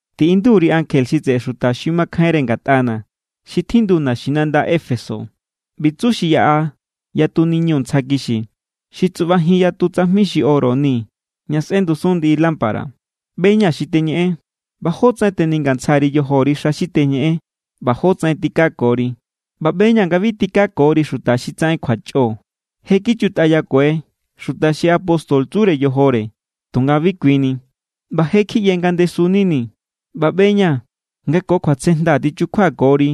’Tiꞌindu_ri ankje xi tseꞌe xuta xi makjainre ngatꞌana̱ xi tjindu naxinanda Éfeso: “ꞌBi tsu xi yaꞌa yatu niñu ntsja kixi, xi tsuꞌbajin yatu tsajmi xi oro ni ña sꞌendusun ndiꞌi lámpara: ꞌBe=ña̱ xi teñeꞌen, ꞌba jótsaꞌen teningantsja_ri yojori xa xi teñeꞌen, ꞌba jótsaꞌen tikakori. ꞌBa ꞌbe=ña̱ nga bi tikakori xuta xi tsaꞌen kjuachꞌo. Je= kichutꞌayakue xuta xi apóstol tsure yojore tunga bi kui ni, ꞌba je= kjiꞌye nga ndesu=nini. ꞌBa ꞌbe=ña̱ nga ko kjuatsejnda tichukjuakori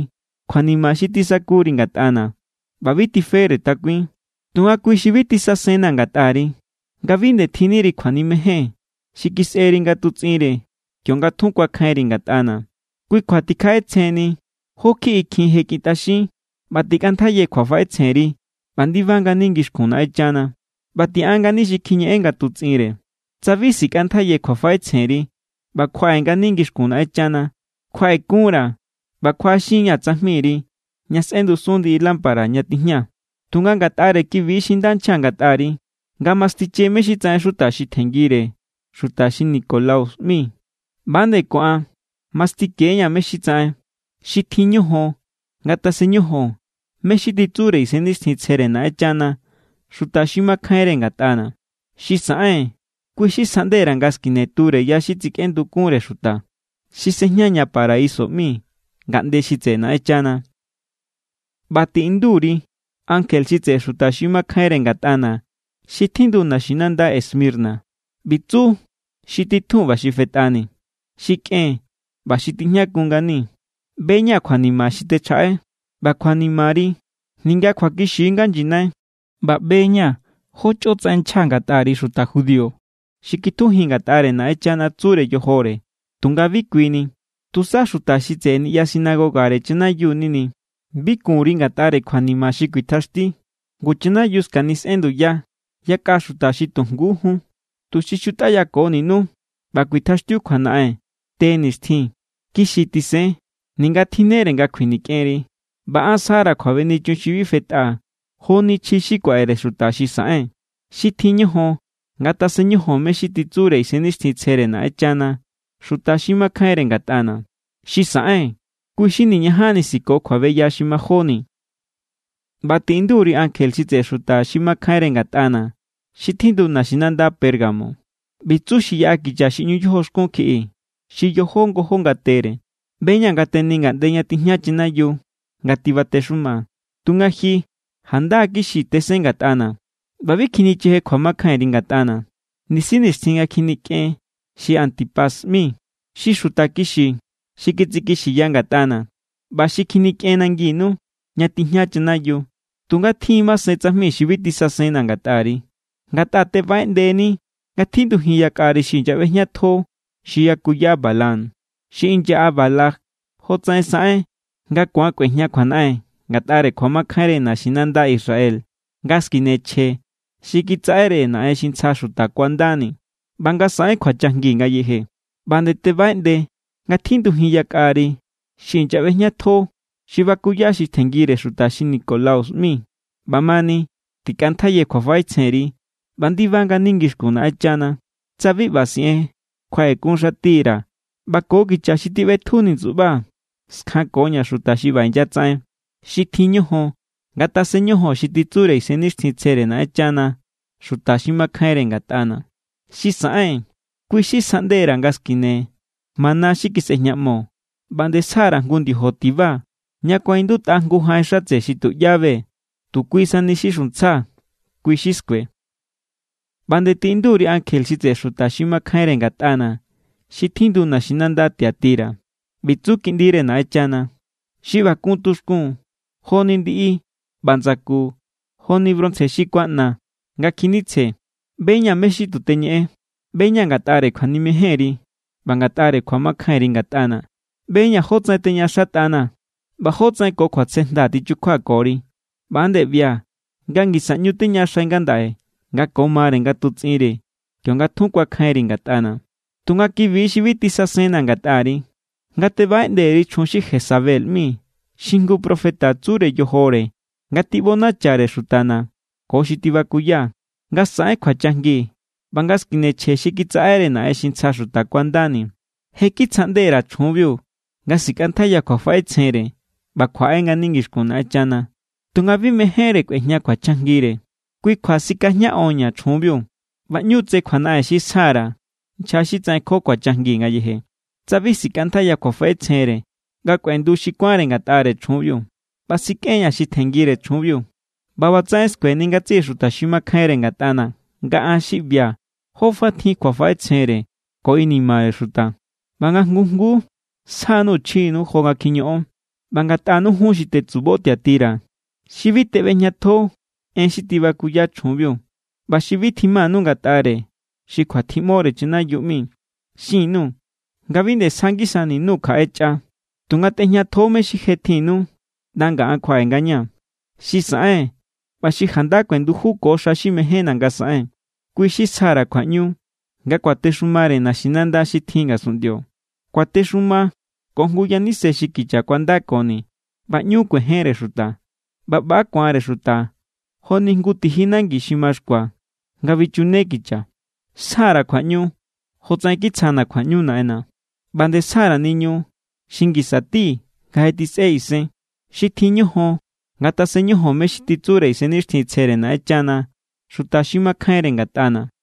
kjuanima xi tisakuri ngatꞌana̱, ꞌba bi tifere takuin. Tunga kui=bi xi bi tisasenna̱ ngatꞌari: nga bi nde tjinniri kjuanimejen xi kisꞌeri ngatutsꞌinre kionga tjun kuakjainri ngatꞌana̱. Kui kjua tikjaꞌetsjenni jó kjiꞌi kjin je kꞌintꞌaxin ꞌba tikꞌantjaiyani kjuafaꞌetsjenri ꞌba ndiba ngani ngixkun Naꞌenchana, ꞌba tiꞌan ngani xi kjiñeꞌen ngatutsꞌinre. Tsa bi sikꞌantjaiyani kjuafaꞌetsjenri ꞌba kjuaꞌe ngani ngixkun Naꞌenchana, kjuaꞌekunra̱ ꞌba kjuaꞌaxin=ña̱ tsajmiri ña sꞌendusun ndiꞌi lámpara ña tijña. Tunga ngatꞌare kibi= xi nda nchja ngatꞌari: nga mastiche mé= xi tsaꞌen xuta xi tjenngire xuta xi Nicolaus ꞌmi. ꞌBa=nde ko an mastike=ña̱ mé= xi tsaꞌen. ¡Xi tjin ñojon ngatasen ñojon mé= xi titsure Isennixtjintsjere Naꞌenchana xuta xi makjainre ngatꞌana̱! Xi saꞌen, kui= xi sjaꞌnde_ra̱ nga skine ture ya xi tsikꞌendukunre xuta, xi sejña ña paraiso ꞌmi, ngaꞌnde xi tseꞌe Naꞌenchana.” ’ꞌBa tiꞌindu_ri ankje xi tseꞌe xuta xi makjainre ngatꞌana̱ xi tjindu naxinanda Esmirna: “ꞌBi tsu xi Titjun ꞌba xi Fetꞌani, xi kꞌen ꞌba xi tijñakun ngani: ꞌBe=ña̱ kjuanima xi techjaꞌai ꞌba kjuanimari, ninga kjuakixi= nga nyinai. ꞌBa ꞌbe=ña̱ jo chꞌotsaꞌen nchja ngatꞌari xuta judío xi kitjujin ngatꞌare Naꞌenchana tsure yojore tunga bi kui ni. Tusa xuta xi tseꞌe niꞌya sinagogare chanayiu=nini. Bi kun_ri ngatꞌare kjuanima xi kuitjaxti. Ngu chanayiu skanisꞌen nduya yakꞌa xuta xi tu jngujún, tuxi xutꞌayakoninú, ꞌba kuitjaxtiu kjuanaꞌen te nixtjin. Kixi tisen, ninga tsa tjinnere nga kjuinikꞌenri, ꞌba an sjara̱ kjuabenichun xi bi fetꞌa joni chji xi kuaꞌere xuta xi saꞌen. ¡Xi tjin ñojon ngatasen ñojon mé= xi titsure Isennixtjintsjere Naꞌenchana xuta xi makjainre ngatꞌana̱! Xi saꞌen, kui xi niñajanni siko kjuabeya xi majóni.” ’ꞌBa tiꞌindu_ri ankje xi tseꞌe xuta xi makjainre ngatꞌana̱ xi tjindu naxinanda Pérgamo: “ꞌBi tsu xi yaꞌa kicha xi ꞌñu yojoxkun kjiꞌi xi yojó ngojó ngatere: ꞌBe=ña̱ nga teni ngaꞌnde ña tijña chanayiu nga tibatexuma. Tunga ji janda= kixi tesen ngatꞌana̱ ꞌba bi kjinicheje kjuamakjainri ngatꞌana̱, nisi nixtjin nga kjinikꞌen xi Antipas ꞌmi. Xi xuta kixi xi kitsikixiya ngatꞌana̱ ꞌba xi kjinikꞌen nanginu, ña tijña chanayiu. Tunga tjin= masen tsajmi xi bi tisasenna̱ ngatꞌari. Ngatꞌa tebaꞌeꞌndeni nga tjindujin yakꞌari xi inyaꞌbejñatjo xi yakuya Balaam. Xi inyaꞌa Balac jotsaꞌen saꞌen nga ku̱an kꞌuejña kjuanaꞌen ngatꞌare kjuamakjainre naxinanda Israel nga skine chje xi kitsaꞌere naꞌen xi ntsja xuta kuandani ꞌba nga saꞌen kjuachajngi ngayeje. ꞌBa nde tebaꞌeꞌnde nga tjindujin yakꞌari xi inyaꞌbejñatjo xi bakuya xi tjenngire xuta xi Nicolaus ꞌmi. ꞌBamani, tikꞌantjaiye kjuafaꞌetsjenri ꞌba ndiba ngani ngixkun Naꞌenchana. Tsa bi ꞌba siꞌen, kjuaꞌekunxatira̱ ꞌba ko kicha xi tiꞌbetjuni ndsuꞌbaa̱ skjankoña̱ xuta xi ꞌba inyatsaꞌen. ¡Xi tjin ñojon ngatasen ñojon xi titsure Isennixtjintsjere Naꞌenchana xuta xi makjainre ngatꞌana̱! Xi saꞌen, kui= xi sjaꞌnde_ra̱ nga skine mana xi kisꞌejñaꞌmo, ꞌba nde sja_ra̱ jngu ndiojo tiba ña kuaꞌindutꞌa jngu jaꞌen xatse xi tuꞌyá be. Tu kui sani xi xuntsja, kui= xi skue.” ’ꞌBa nde tiꞌindu_ri ankje xi tseꞌe xuta xi makjainre ngatꞌana̱ xi tjindu naxinanda Tiatira: “ꞌBi tsu Kiꞌndire Naꞌenchana, xi ꞌba kun tuxkun joni ndiꞌi ꞌba ndsaku joni bronce xi kuaꞌna nga kjinitsje: ꞌBe=ña̱ mé= xi tu ñeꞌen. ꞌBe=ña̱ ngatꞌare kjuanimejenri ꞌba ngatꞌare kjuamakjainri ngatꞌana̱. ꞌBe=ña̱ jótsaꞌen teñaꞌaxatꞌanaa̱ ꞌba jótsaꞌen ko kjuatsejnda tichukjuakori. ꞌBa=nde ꞌbia̱ nga ngisa ꞌñu teñaꞌaxai ngandaꞌe nga ko mare ngatutsꞌinre kionga tjun kuakjainri ngatꞌana̱. Tunga kibi= xi bi tisasenna̱ ngatꞌari, nga tebaꞌeꞌnde_ri chjun xi Jezabel ꞌmi xi jngu profeta tsure yojore nga tiꞌbonachare xutana̱ ko xi tibakuya nga saꞌen kjuachajngi ꞌba nga skine chje xi kitsaꞌere naꞌen xi ntsja xuta kuandani. Je= kitsjaꞌnde_ra̱ chjunbiu nga sikꞌantjaiya kjuafaꞌetsjenre ꞌba kjuaꞌe ngani ngixkun Naꞌenchana, tunga bi mejénre kꞌuejña kjuachajngire. Kui kjua sikajñaꞌonña̱ chjunbiu, ꞌba ꞌñu tse kjuanaꞌen xi sja_ra̱ nchja xi tsaꞌenko kjuachajngi ngayeje, tsa bi sikꞌantjaiya kjuafaꞌetsjenre nga kꞌuendu xi kuánre ngatꞌare chjunbiu. ꞌBa sikꞌen=ña̱ xi tjenngire chjunbiu, ꞌba ꞌbatsaꞌen skueni ngatsiꞌi xuta xi makjainre ngatꞌana̱ nga an xi ꞌbia̱ jó fa tjin kjuafaꞌetsjenre ko inimare xuta. ꞌBa nga jngu jnguu sjanu chjinu jo nga kjiñoꞌon. ꞌBa ngatꞌanu jun xi tetsubo Tiatira xi bi teꞌbejñatjo en xi tibakuya chjunbiu ꞌba xi bi tjimanu ngatꞌare xi kjuatjiꞌmore chanayiu ꞌmi, xin_nuu̱ nga bi nde sja ngisani_nuu̱ kjaꞌe chꞌa. Tunga tꞌejñatjo=ñu mé= xi je tjinnu ꞌnda nga̱ an kjuaꞌe ngañaa̱. Xi saꞌen ꞌba xi janda kuendujuko xa xi mejénna̱ nga saꞌen, kui= xi sja_ra̱ kjuaꞌñu nga kuatexumare naxinanda xi tjin ngasunꞌndio. Kuatexuma ko jngu yaníse xi kicha kuandakoni. ꞌBa ꞌñu kuejenre xuta, ꞌba ꞌba= ku̱anre xuta joni jngu tiji nangi xi maxkua nga bichune kicha. Sja_ra̱ kjuaꞌñu jotsaꞌen kitsjana̱ kjuaꞌñu Naꞌenna̱. ꞌBa nde sja_ra̱ niñu xi ngisa tí nga je tjisꞌe isen. ¡Xi tjin ñojon ngatasen ñojon mé= xi titsure Isennixtjintsjere Naꞌenchana xuta xi makjainre ngatꞌana̱!”